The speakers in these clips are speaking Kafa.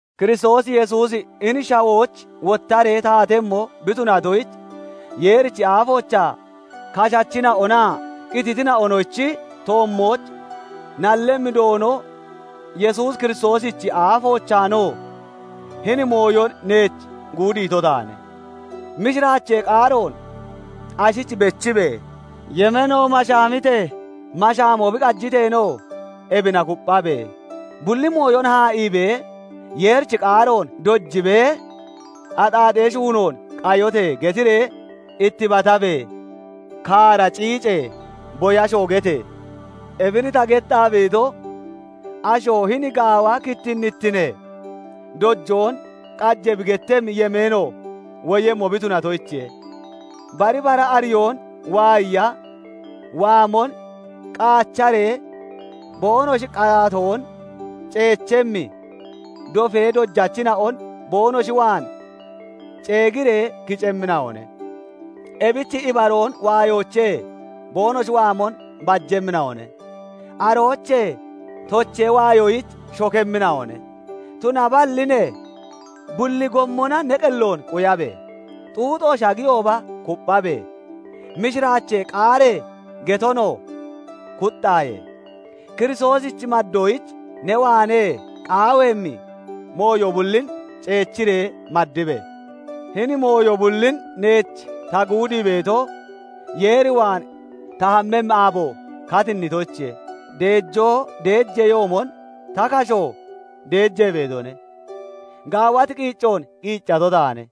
Kiristoos Yesuusi hini shawooch wottaree taatemmo bi tunatoyich, Yeerichi aafoochaa, kashachina'onaa qititina'onochi toommooch nallemmi Doono Yesuus Kiristoosichi aafoochaanoo hini mooyon neech guudiito taane; mishiraachee qaaroon ashich bechibe! Yemeeno mashaamitee, mashaamoo bi qajiteenoo, ebina kupphabe! Bulli mooyon haa'iibee, Yeerichi qaaroon dojibee, "Axaaxee shuunoon qayote!" getiree ittibatabe! Kaara ciice! Boyashoo gete! Ebin ta gettaa beeto, asho hini gaawa kittinnittinee doyoon qaje bi gettemmi yemeeno woyemmo bi tunatoyichiye. Bari bara ariyoon waayiya waamon qaacharee boonoshi qaatoon ceechemmi dofee dojachina'on boonoshi waan ceegiree kicemmina'one Ebich ibaroon waayoochee boonoshi waamon bajemmina'one; aroochee tochee waayoyich shokemmina'one; tunaballi ne, bulli gommona ne qelloon quyabe! Xuuxo shagiyooba kupphabe! Mishiraachee qaaree getonoo kuxxaaye! Kiristoosich maddoyich ne waanee qaaweemmi mooyo bullin ceechiree maddibe! Hini mooyo bullin neech ta guudii beeto, Yeer waan ta hammemmi aabo katinnitoyichiye; deejoo deejeyoomon ta kasho deejee beetone. Gaawati qiiccoon qiiccato taane;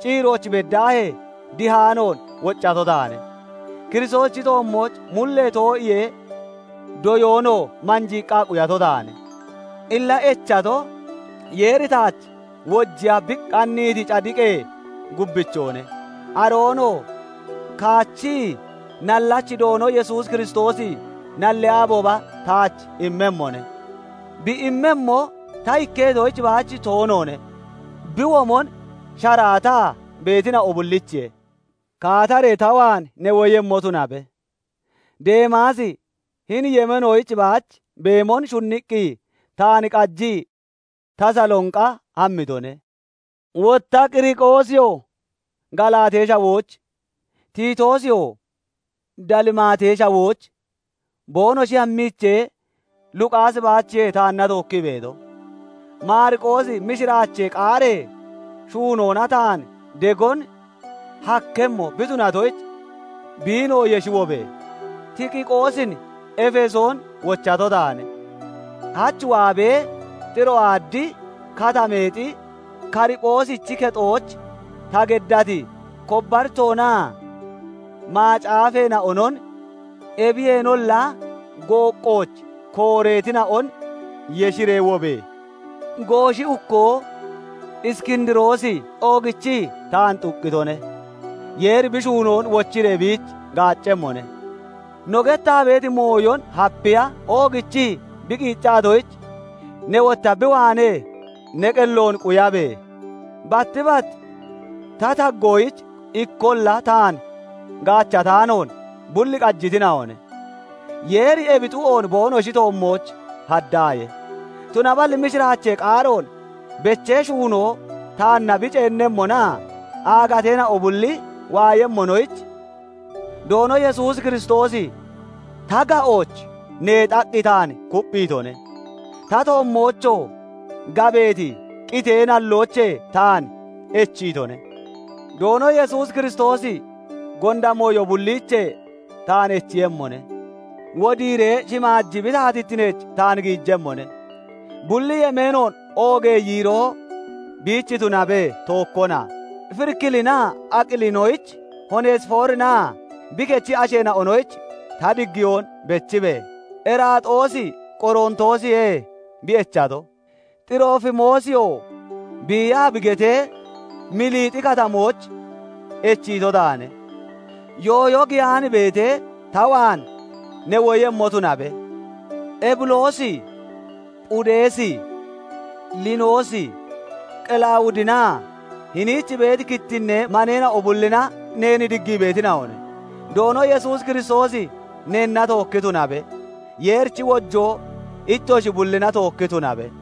ciirooch beddaahee dihaanoon woccato taane; Kiristoosichi toommooch mullee too'iyee doyoonoo manjiiqqa quyato taane. Illa echato, Yeeri taach wojiya bi qanniiti cadiqee gubbichoone; aroonoo kaachii nallachi Doono Yesuus Kiristoosi nallee aabooba taach immemmone; bi immemmo, ta ikketoyich baach toonoone; bi womon sharaataa beetina'o bullichiye. Kaataree ta waan ne woyemmo tunabe. Deemaasi hini yemeenoyich baach beemon shunniqqi taan qajii Tasalonqa hammitone; wotta Qiriqoosiyoo Galaatee Shawooch, Titoosiyoo Dalimaatee Shawooch boonoshi hammiichee, Luqaasi baachiye taanna tookkii beeto. Maariqoosi mishiraachee qaaree shuunoona taan degon hakkemmo bi tunatoyich, biinoo yeshi wobe! Tikiqoosin Efesoon wochato taane. Hach waabee Xiroaadi Katameexi Kaariphoosichi kexooch ta geddati kobbaritoonaa macaafeena'onon, ebiyeenolla gooqqooch kooreetina'on yeshiree wobe! Gooshi ukkoo Iskindiroosi oogichii taan xuqqitone; Yeeri bi shuunoon wochiree biich gaaccemmone. No gettaa beeti mooyon hapiya oogichii bi qiiccatoyich, ne wotta bi waanee ne qelloon quyabe! Batti batti ta taggoyich ikkolla taan gaachataanoon bul qajitina'one; Yeeri ebi xu'oon boonoshi toommooch haddaaye; tunaballi mishiraachee qaaroon bechee shuunoo taanna bi ceennemmonaa aagateena'o bulli waayemmonoyich, Doono Yesuus Kiristoosi ta ga'ooch neexaqqi taan kupphiitone; ta toommoochoo gabeeti qitee nalloochee taan echiitone. Doono Yesuus Kiristoosi gonda mooyo bulliichee taan echiiyemmone; wodiiree shimaaji bi taatittineech taan giijemmone; bulli yemeenoon oogee yiiroo biich tunabe; tookkona. Firikilinaa Aqilinoyich, Hoonesifoorinaa bi kechi asheena'onoyich ta diggiyoon beechibe! Eraaxoosi Qorontoosiye bi echato; Xiroofimoosiyoo biiyaa bi getee, Miliixi Katamooch echiito taane. Yooyo giyaani beetee, ta waan ne woyemmo tunabe! Ebuloosi, Phuudeesi, Liinoosi, Qelawudinaa hiniich beeti kittinnee maneena'o bullina neen diggii beetina'one. Doono Yesuus Kiristoosi neenna tookki tunabe. Yeerichi wojoo ittoshi bullina tookki tunabe.